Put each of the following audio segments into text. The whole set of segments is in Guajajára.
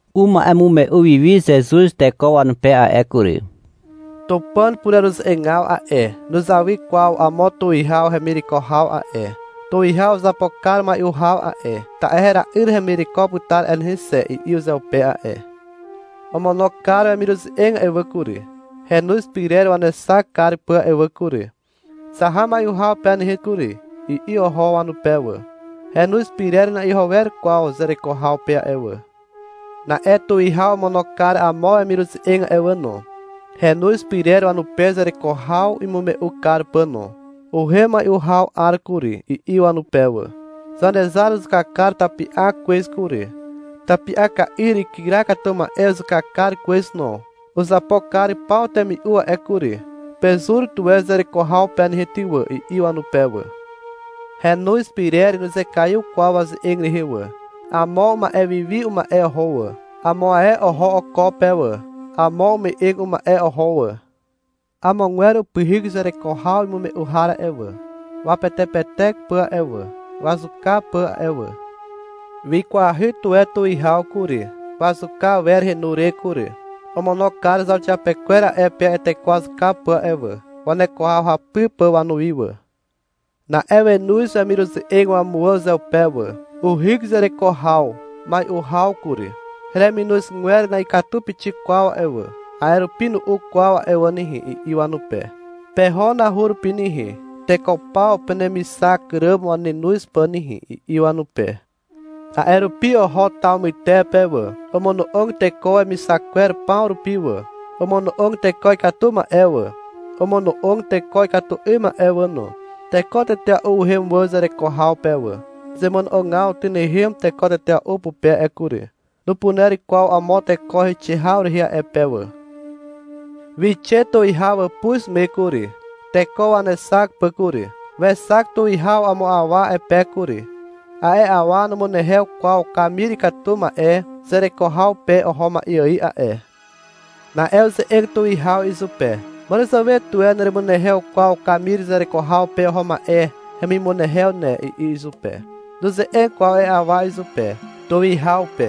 Uma'emume'u wi wi Zezuz teko wanupe a'e kury. — Tupàn pureruze'egaw a'e, nuzawy kwaw amo tuwihaw hemireko haw a'e. Tuwihaw uzapo kar mai'u haw a'e, ta'e — Hera'yr hemireko putar a'e nehe xe, i'i uzeupe a'e. Omono kar wemiruze'eg a'e wà kury, henoz pyrer wanexak kar pà a'e wà kury, — Zaha mai'u haw pe nehe kury, i'i oho wanupe wà. Henoz pyrer na'iho wer kwaw zereko haw pe a'e wà. Na'e tuwihaw omono kar amo wemiruze'eg a'e wà no, henoz pyrer wanupe zereko haw imume'u kar pà no. — Uhem mai'u haw 'ar kury, i'i wanupe wà. — Zanezar uzuka kar tapi'ak kwez kury. Tapi'aka'yr ikyra katu ma'e uzuka kar kwez no. Uzapo kar paw temi'u a'e kury. Pezur tuwe zereko haw pe nehe ty wà, i'i wanupe wà. Henoz pyrer nuzekaiw kwaw waze'eg rehe wà. Amo uma'e wiwi uma'e oho wà. Amo ae oho oko pe wà. Amo ume'eg uma'e oho wà. Amogwer upyhyk zereko haw imume'u har a'e wà, wapetepetek pà a'e wà, wazuka pà a'e wà. Wikwahy tuwe tuwihaw kury, wazuka awer henu re kury. Omono kar zauxiapekwer a'e pe a'e teko wazuka pà a'e wà, waneko haw hapy pà wanuwi wà. Na'e wenoz wemiruze'eg wamuwà uzeupe wà. — Uhyk zereko haw mai'u haw kury. Hereminozgwer na'ikatu pixik kwaw a'e wà, a'e rupi nu'u kwaw a'e wà nehe, i'i wanupe. — Peho nahu rupi nehe, teko paw penemixak ràm wanenoz pà nehe, i'i wanupe. A'e rupi oho taw mytepe wà. Omono'og teko wemixak kwer paw rupi wà. Omono'og teko ikatu ma'e wà. Omono'og teko ikatu 'ym ma'e wà no. Teko tetea'u uhem wà zereko haw pe wà. Zemono'ogaw tynehem teko tetea'u pupe a'e kury. Nupuner kwaw amo teko heixe haw rehe a'e pe wà. Wixe tuwihaw wàpuz me kury, teko wanexak pà kury. Wexak tuwihaw amo awa a'e pe kury. A'e awa numunehew kwaw kamir ikatu ma'e zereko haw pe oho ma'e ài a'e. Na'e uze'eg tuwihaw izupe. Màràzàwe tuwe neremunehew kwaw kamir zereko haw pe oho ma'e hemimunehew ne, i'i izupe. Nuze'eg kwaw a'e awa izupe, tuwihaw pe.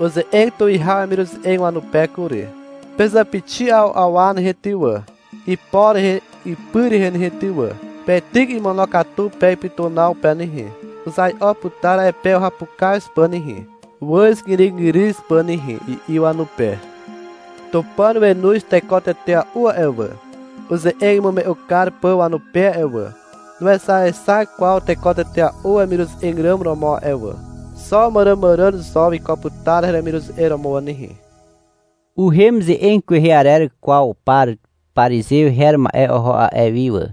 Uze'eg tuwihaw wemiruze'eg wanupe kury. — Pezàpixi 'aw awa nehe ty wà, ipo rehe ipy rehe nehe ty wà. Peityk imonokatu pe ipytunaw pe nehe. Uzai'o putar a'e pe uhapukaz pà nehe, wàzgyrygyryw pà nehe, i'i wanupe. Tupàn wenoz teko tetea'u a'e wà, uze'eg imume'u kar pà wanupe a'e wà. Nuexaexak kwaw teko tetea'u wemiruze'eg ràm romo a'e wà. Xo màràmàràn zo wiko putar hemiruze'eg romo wà nehe. Uhem ze'eg kwehe arer kwaw par parizew her ma'e oho a'e wi wà,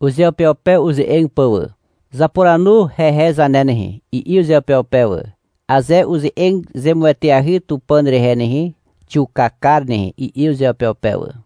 uzeupeupe uze'eg pà wà. — Zapuranu hehe zane nehe, i'i uzeupeupe wà. — Aze uze'eg zemueteahy Tupàn rehe nehe, xiuka kar nehe, i'i uzeupeupe wà.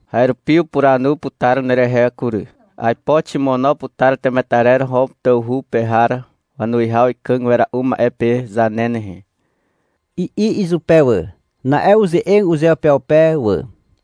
— A'e rupi urupuranu putar nerehe kury. Aipo ximono putar temetarer Hom tawhu pe har wanuwihaw ikàg wera'u ma'e pe zane nehe, i'i izupe wà. (Na'e uze'eg uzeupeupe wà,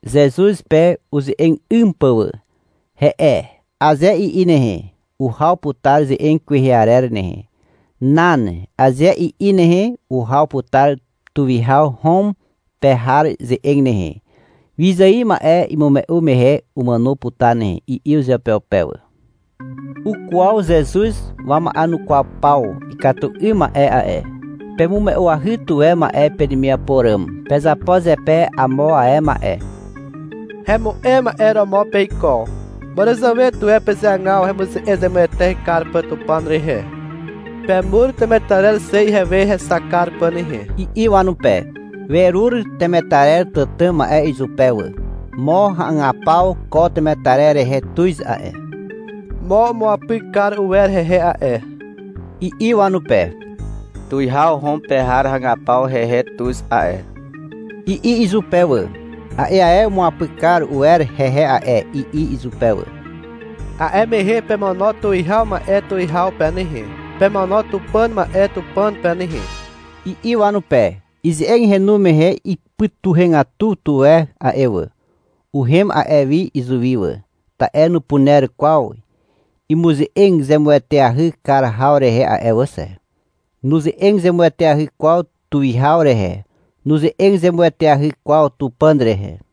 Zezuz pe uze'eg 'ym pà wà. — He'e, aze i'i nehe, uhaw putar ze'eg kwehe arer nehe. — Nan, aze i'i nehe, uhaw putar tuwihaw Hom pe har ze'eg nehe. — Wyzài ma'e imume'u mehe umàno putar nehe, i'i uzeupeupe wà.) Ukwaw Zezuz wama'enukwaw paw ikatu 'ym ma'e a'e. — Pemume'uahy tuwe ma'e penemiapo ràm. Pezapo zepe amo ae ma'e. Hemu'em ma'e romo peiko. Màràzàwe tuwe pezeagaw hemuze'eg zemueteahy kar pà Tupàn rehe. Pemur temetarer xe ihewe hexak kar pà nehe, i'i wanupe. Werur temetarer tàtà ma'e izupe wà. — Mo hagapaw ko temetarer rehe tuz a'e, mo umuapyk kar uwer hehe a'e, i'i wanupe. — Tuwihaw Hom pe har hagapaw hehe tuz a'e, i'i izupe wà. — A'e ae umuapyk kar uwer rehe a'e, i'i izupe wà. — A'e mehe pemono tuwihaw ma'e tuwihaw pe nehe. Pemono Tupàn ma'e Tupàn pe nehe, i'i wanupe. Ize'eg henu mehe ipytuhegatu tuwe a'e wà. Uhem a'e wi izuwi wà. Ta'e nupuner kwaw imuze'eg zemueteahy kar haw rehe a'e wà xe. Nuze'eg zemueteahy kwaw tuwihaw rehe. Nuze'eg zemueteahy kwaw Tupàn rehe.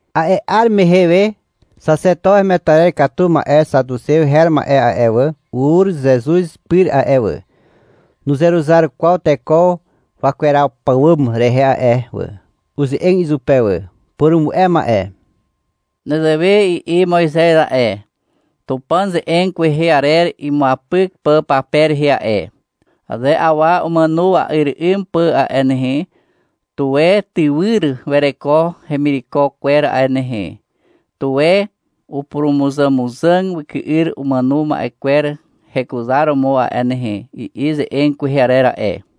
A'e 'ar mehe we, xaxeto hemetarer katu ma'e xatuxew her ma'e a'e wà, ur Zezuz pyr a'e wà. (Nuzeruzar kwaw teko wakweraw pàwàm rehe a'e wà.) Uze'eg izupe wà. — Purumu'e ma'e. Nezewe i'i Moizez a'e, Tupàn ze'eg kwehe arer imuapyk pà pape rehe a'e. — Aze awa umàno wa'yr 'ym pà a'e nehe, tuwe tywyr wereko hemireko kwer a'e nehe, tuwe upurumuzàmuzàg wyky'yr umàno ma'e kwer hekuzaromo a'e nehe, i'i ze'eg kwehe arer a'e.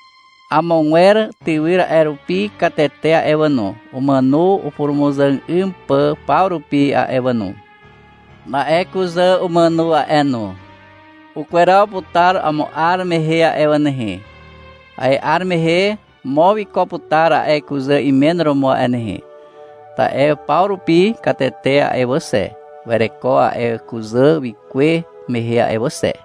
Amogwer tywyr a'e rupi katete a'e wà no, umàno upurumuzàg 'ym pà paw rupi a'e wà no. Na'e kuzà umàno a'e no. Ukweraw putar amo 'ar mehe a'e wà nehe. A'e 'ar mehe, mo wiko putar a'e kuzà imen romo a'e nehe, ta'e paw rupi katete a'e wà xe, wereko a'e kuzà wikuwe mehe a'e wà xe.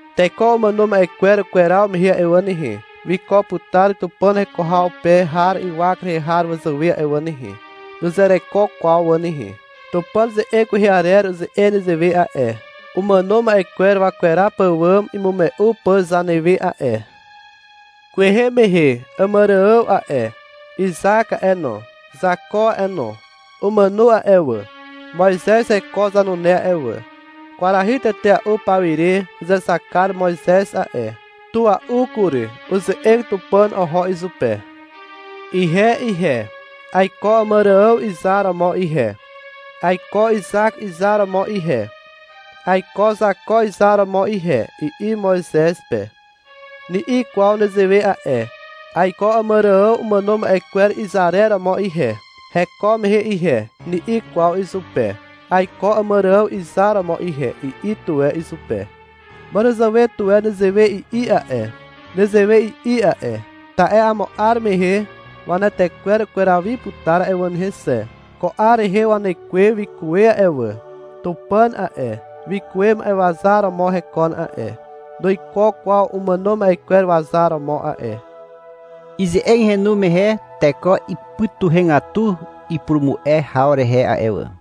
Teko umàno ma'e kwer ukweraw mehe a'e wà nehe, wiko putar Tupàn heko haw pe har ywak rehe har wazàwe a'e wà nehe. Nuzereko kwaw wà nehe. Tupàn ze'eg kwehe arer uze'eg nezewe a'e, umàno ma'e kwer wakweraw pàwàm imume'u pà zanewe a'e. Kwehe mehe Àmàrààw a'e, Izak a'e no, Zako a'e no, umàno a'e wà, Moizez heko zanune a'e wà. Kwarahy tetea'u pawire uzexak kar Moizez a'e. Tua'u kury. Uze'eg Tupàn oho izupe. — Ihe ihe, aiko Àmàrààw izar romo ihe, aiko Izak izar romo ihe, aiko Zako izar romo ihe, i'i Moizez pe. Ni'i kwaw nezewe a'e. — Aiko Àmàrààw umàno ma'e kwer izarer romo ihe, heko mehe ihe, ni'i kwaw izupe. — Aiko Àmàrààw izar romo ihe, i'i tuwe izupe. Màràzàwe tuwe nezewe i'i a'e. Nezewe i'i a'e, ta'e amo 'ar mehe wanetekwer ukweraw wi putar a'e wà nehe xe. Ko 'ar rehe wanekwe wikuwe a'e wà. Tupàn a'e, wikuwe ma'e wazar romo hekon a'e, nuiko kwaw umàno ma'e kwer wazar romo a'e. Ize'eg henu mehe teko ipytuhegatu ipurumu'e haw rehe a'e wà.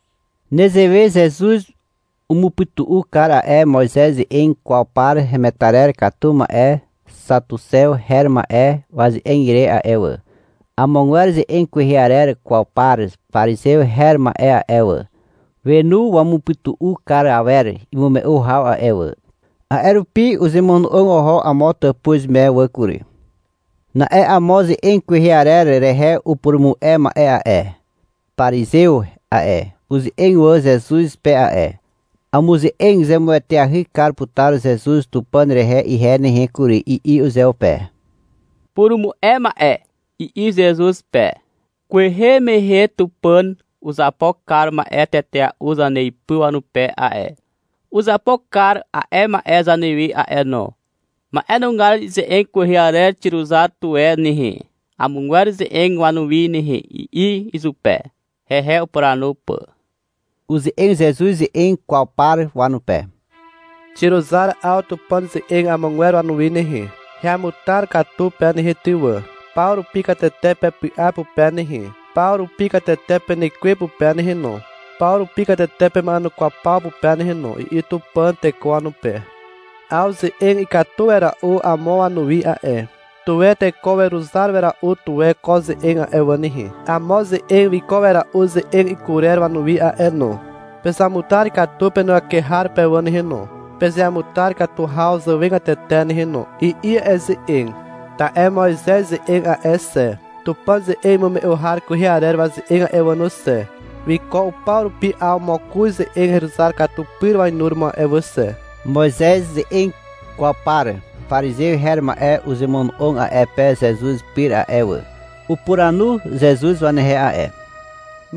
Nezewe Zezuz umupytu'u kar a'e Moizez ze'eg kwaw par hemetarer katu ma'e xatuxew her ma'e waze'eg ire a'e wà. Amogwer ze'eg kwehe arer kwaw par parizew her ma'e a'e wà, wenu wamupytu'u kar awer imume'u haw a'e wà. A'e rupi uzemono'og oho (amo tàpuz me) wà kury. Na'e amo ze'eg kwehe arer rehe upurumu'e ma'e a'e, parizew a'e, uze'eg wà Zezuz pe a'e. — Amuze'eg zemueteahy kar putar Zezuz Tupàn rehe ihe nehe kury, i'i uzeupe. — Purumu'e ma'e, i'i Zezuz pe. — Kwehe mehe Tupàn uzapo kar ma'e tetea'u zaneipy wanupe a'e. Uzapo kar a'e ma'e zanewe a'e no. Ma'enugar ize'eg kwehe arer xiruzar tuwe nehe, amogwer ze'eg wanuwi nehe, i'i izupe, hehe upuranu pà. Uze'eg Zezuz ze'eg kwaw par wanupe. — Xiruzar 'aw Tupàn ze'eg amogwer wanuwi nehe. — Heamutar katu pe nehe ty wà, paw rupi katete pepy'a pupe nehe, paw rupi katete penekwe pupe nehe no, paw rupi katete pema'enukwaw paw pupe nehe no, i'i Tupàn teko wanupe. 'Aw ze'eg ikatu wera'u amo wanuwi a'e. Tuwe teko weruzar wera'u tuwe ko ze'eg a'e wà nehe. Amo ze'eg wiko wera'u ze'eg ikurer wanuwi a'e no. — Pezamutar katu penuwake har pe wà nehe no, pezeamutar katu haw zàwegatete nehe no, i'i a'e ze'eg. Ta'e Moizez ze'eg a'e xe, Tupàn ze'eg imume'u har kwehe arer waze'eg a'e wà no xe, wiko upaw rupi 'aw mokoz ze'eg heruzar katu pyr wainuromo a'e wà xe. Moizez ze'eg kwaw par parizew her ma'e uzemono'og a'e pe Zezuz pyr a'e wà. Upuranu Zezuz wanehe a'e.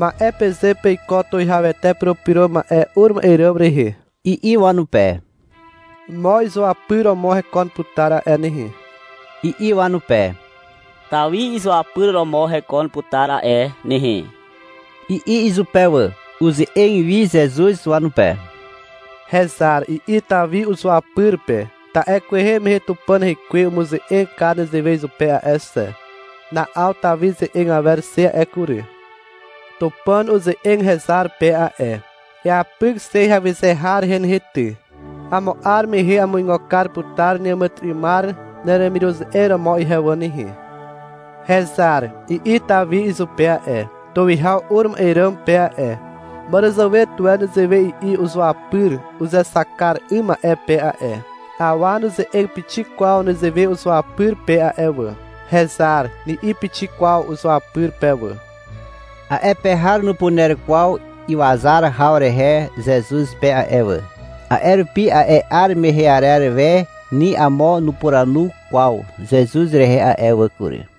— Ma'e peze peiko Tuwihawete Purupyro Ma'e ur ma'e ràm rehe, i'i wanupe. — Mo izuapyr romo hekon putar a'e nehe, i'i wanupe. — Tawi izuapyr romo hekon putar a'e nehe, i'i izupe wà. Uze'eg wi Zezuz wanupe. — Hezar, i'i Tawi uzuapyr pe. Ta'e kwehe mehe Tupàn Hekwe umuze'eg kar nezewe izupe a'e xe. Na'aw Tawi ze'eg awer xe a'e kury. Tupàn uze'eg hezar pe a'e. — Eapyk xe heawyze har rehe nehe ty. Amo 'ar mehe amuigo kar putar neàmàtyry'ymar neremiruze'eg romo ihe wà nehe. — Hezar, i'i Tawi izupe a'e, tuwihaw ur ma'e ràm pe a'e. Màràzàwe tuwe nezewe i'i uzuapyr uzexak kar 'ym ma'e pe a'e. Awa nuze'eg pixik kwaw nezewe uzuapyr pe a'e wà. — Hezar, ni'i pixik kwaw uzuapyr pe wà. A'e pe har nupuner kwaw iwazar haw rehe Zezuz pe a'e wà. A'e rupi a'e 'ar mehe arer we ni amo nupuranu kwaw Zezuz rehe a'e wà kury.